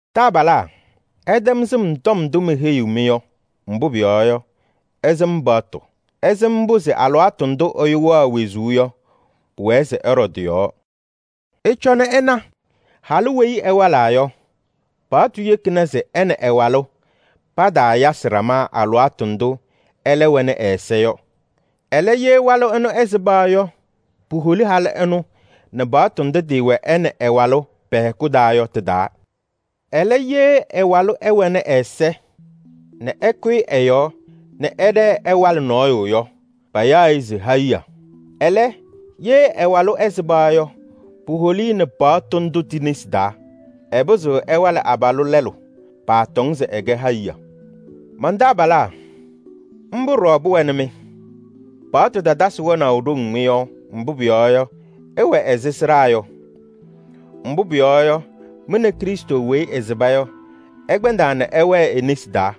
Taabalaa, ɩtɛm sɩm tɔm ndʋ meheyiɣ-mɩ yɔ, mbʋ pʋyɔɔ yɔ, ɩsɩm paɣtʋ: ɩsɩm mbʋ se alɩwaatʋ ndʋ ɛyʋ wɛɣ wezuu yɔ pʋwɛɛ se ɛɖɔ tɩ-yɔɔ. Ɩcɔnɩ ɩna, halʋ weyi ɛwalaa yɔ, paɣtʋ yekina se ɛ nɛ ɛ-walʋ pataayasɩ ɖama alɩwaatʋ ndʋ ɛlɛ wɛnɩ ɛ-ɛza yɔ. Ɛlɛ, ye walʋ ɛnʋ ɛsɩba yɔ, puholi halʋ ɛnʋ nɛ paɣtʋ ndʋ tɩɩwɛ ɛ nɛ ɛ-walʋ pɛ-hɛkʋ taa yɔ tɩ-taa. Ɛlɛ, ye ɛ-walʋ ɛwɛnɩ ɛ-ɛza nɛ ɛkʋyɩ ɛ-yɔɔ nɛ ɛɖɛɛ ɛwalɩ nɔɔyʋ yɔ, payaɣ-ɩ se hayiɣa. Ɛlɛ, ye ɛ-walʋ ɛsɩba yɔ, puholi-i nɛ paɣtʋ ndʋ ti-nesi taa. Ɛpɩzɩɣ ɛwalɩ abalʋ lɛlʋ, paatɔŋ se ɛkɛ hayiɣa. Man-taabalaa, mbʋ ɖɔɖɔ pʋwɛnɩ-mɩ. Paɣtʋ tatasɩ wɛnaʋ ɖoŋ mɩ-yɔɔ, mbʋ pʋyɔɔ yɔ, ɩwɛ ɛzɩ sɩɖaa yɔ. Mbʋ pʋyɔɔ yɔ, mɩ nɛ Krɩstʋ weyi ɛsɩba yɔ, ɩkpɛndaa nɛ ɩwɛɛ e-nesi taa.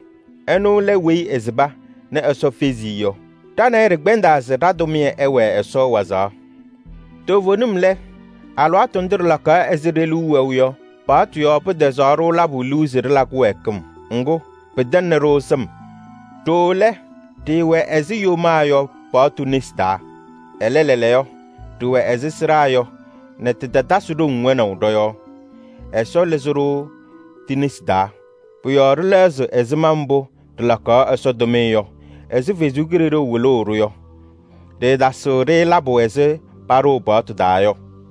Ɛnʋ lɛ weyi ɛsɩba nɛ Ɛsɔ fezi-i yɔ. Ɖa nɛ ɩ ɖɩkpɛndaa se ɖa-tʋmɩyɛ ɛwɛɛ Ɛsɔ wazaɣ. Toovenim lɛ, alɩwaatʋ ndʋ ɖɩlakaɣ ɛzɩ ɖe-liu wɛʋ yɔ, paɣtʋ yɔɔ pɩtɛzaɣ-ɖʋ labʋ liu se ɖɩla kɩwɛɛkɩm. Ŋgʋ, pɩtɛŋnɩ-ɖʋ sɩm. Ɖooo lɛ, ɖɩɩwɛ ɛzɩ yomaa yɔ paɣtʋ nesi taa. Ɛlɛ, lɛɛlɛɛyɔ ɖɩwɛ ɛzɩ sɩɖaa yɔ nɛ tɩtatasɩ ɖoŋ wɛnaʋ ɖɔ-yɔɔ. Ɛsɔ lɩzɩ-ɖʋ ti-nesi taa. Pʋ-yɔɔ ɖɩlɛɣzɩ ɛzɩma mbʋ ɖɩlakaɣ Ɛsɔ tʋmɩyɛ yɔ ɛzɩ Ɛsɔ Kalɩzaɣ wɩlʋʋ-ɖʋ yɔ. Ɖɩɩtasɩɣ-ɖɩ labʋ ɛzɩ paɖʋʋ paɣtʋ taa yɔ.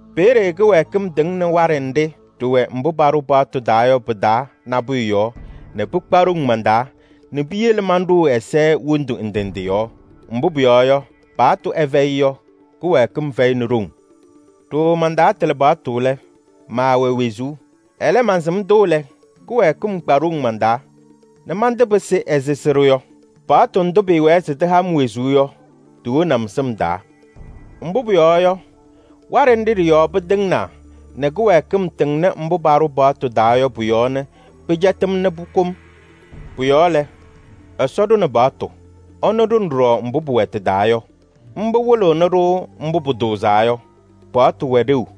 Peeye kɩwɛɛkɩm tɩŋnɩ waɖɛ nɖɩ ɖɩwɛ mbʋ paɖʋ paɣtʋ taa yɔ pɩ-taa nabʋyʋ yɔɔ nɛ pɩkpa ɖoŋ man-taa nɛ piyele manɖʋʋ ɛza wondu ndɩ ndɩ yɔɔ. Mbʋ pʋyɔɔ yɔ, paɣtʋ ɛfɛyɩ yɔ, kɩwɛɛkɩm fɛyɩnɩ ɖoŋ. Ɖooo mantaatɩlɩ paɣtʋ lɛ, maawɛ wezuu. Ɛlɛ, mansɩm-tʋ lɛ, kɩwɛɛkɩm kpa ɖoŋ man-taa nɛ mantɩpɩsɩ ɛzɩ sɩɖʋ yɔ: paɣtʋ ndʋ pɩɩwɛɛ se tɩha-m wezuu yɔ, tiwoni-m sɩm taa. Mbʋ pʋyɔɔ yɔ, waɖɛ nɖɩ ɖɩ-yɔɔ pɩtɩŋnaa nɛ kɩwɛɛkɩm tɩŋnɩ mbʋ paɖʋ paɣtʋ taa yɔ pʋ-yɔɔ nɛ pɩcɛtɩ-m nɛ pʋkʋ-m. Pʋ-yɔɔ lɛ, Ɛsɔ ɖʋnɩ paɣtʋ, ɛnʋ ɖʋnɩ ɖɔɖɔ mbʋ pʋwɛ tɩ-taa yɔ. Mbʋ wɩlɩɣnɩ-ɖʋ mbʋ pʋtʋʋzaa yɔ, pʋwɛ ɖeu.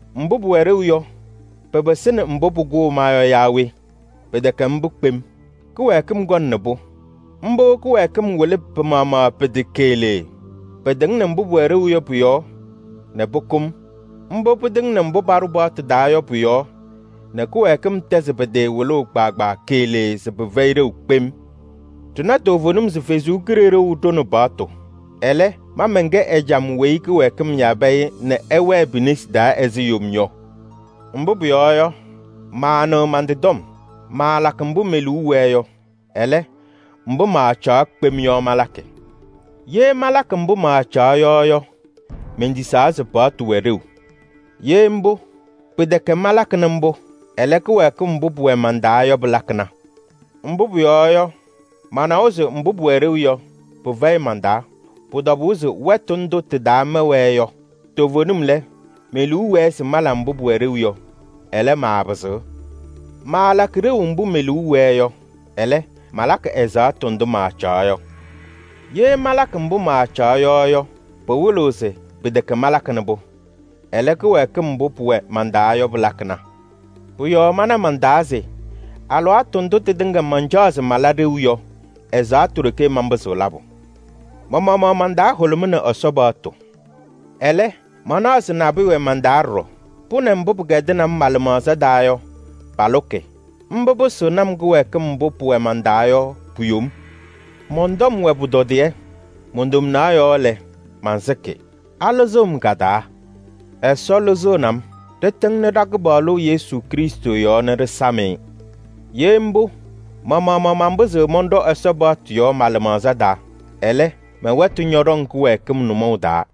Mbʋ pʋwɛ ɖeu yɔ, pɩpɩsɩnɩ mbʋ pʋkʋʋ ma yɔ yaa we? Pɩtɛkɛ mbʋ kpem! Kɩwɛɛkɩm kɔnɩnɩ-pʋ. Mbʋ kɩwɛɛkɩm wɩlɩ pɩ-maɣmaɣ pɩ-tɩ keɣlee: pɩtɩŋnɩ mbʋ pʋwɛ ɖeu yɔ pʋ-yɔɔ nɛ pʋkʋ-m. Mbʋ pɩtɩŋnɩ mbʋ paɖʋ paɣtʋ taa yɔ pʋ-yɔɔ nɛ kɩwɛɛkɩm tɛzɩ pɩ-tɩ wɩlʋʋ kpaagbaa keɣlee se pɩfɛyɩ ɖeu kpem. Ɖɩna toovenim se Ɛsɔ Kalɩzaɣ ɖʋnɩ paɣtʋ. Ɛlɛ, ma mɛnkɛ ɛjam weyi kɩwɛɛkɩm yabɩ-ɩ nɛ ɛwɛɛ pi-nesi taa ɛzɩ yom yɔ. Mbʋ pʋyɔɔ yɔ, maanɩɣ man-tɩ tɔm. Maalakɩ mbʋ me-liu wɛɛ yɔ. Ɛlɛ, mbʋ maacaɣ kpem yɔ malakɩ. Ye malakɩ mbʋ maacaɣ yɔ yɔ, mentisaa se paɣtʋ wɛ ɖeu. Ye mbʋ, pɩtɛkɛ malakɩnɩ mbʋ. Ɛlɛ, kɩwɛɛkɩm mbʋ pʋwɛ man-taa yɔ pɩlakɩna. Mbʋ pʋyɔɔ yɔ, manawa se mbʋ pʋwɛ ɖeu yɔ, pɩfɛyɩ man-taa: pʋ-tɔbʋʋ se wɛtʋ ndʋ tɩ-taa mɛwɛɛ yɔ. Toovenim lɛ, me-liu wɛɛ se mala mbʋ pʋwɛ ɖeu yɔ. Ɛlɛ, maapɩzɩɣ. Maalakɩ ɖeu mbʋ me-liu wɛɛ yɔ, ɛlɛ, malakɩ ɛzaɣtʋ ndʋ maacaɣ yɔ. Ye malakɩ mbʋ maacaɣ yɔ yɔ, pɩwɩlɩɣ se pɩtɛkɛ malakɩnɩ-pʋ. Ɛlɛ, kɩwɛɛkɩm mbʋ pʋwɛ man-taa yɔ pɩlakɩna. Pʋ-yɔɔ mana man-taa se: alɩwaatʋ ndʋ tɩtɩŋa mancaɣ se mala ɖeu yɔ, ɛzaɣtʋ ɖeke manpɩzɩɣ labʋ. Ma-maɣmaɣ man-taa hʋlʋmɩnɩ Ɛsɔ paɣtʋ. Ɛlɛ, manaɣ se nabʋyʋ wɛ man-taa ɖɔɖɔ, pʋ nɛ mbʋ pɩkɛdɩnɩ-m ma-lɩmaɣza taa yɔ palʋkɩ. Mbʋ pɩsɩɣnɩ-m kɩwɛɛkɩm mbʋ pʋwɛ man-taa yɔ pu-yom. Mɔn-tɔm wɛ pʋtɔdɩyɛ! Mon-tomnaɣ yɔɔ lɛ, mansɩkɩ. Alɩzɩɣ-m ka-taa? Ɛsɔ lɩzɩɣnɩ-m! Ɖɩtɩŋnɩ ɖa-Kɩpaɣlʋ Yesu Krɩstʋ yɔɔ nɛ ɖɩsam-ɩ! Ye mbʋ, ma-maɣmaɣ manpɩzɩɣ mɔnɖɔ Ɛsɔ paɣtʋ yɔɔ ma-lɩmaɣza taa. Ɛlɛ, mɛ-wɛtʋ ñɔɖɔŋ kɩwɛɛkɩm nʋmɔʋ taa.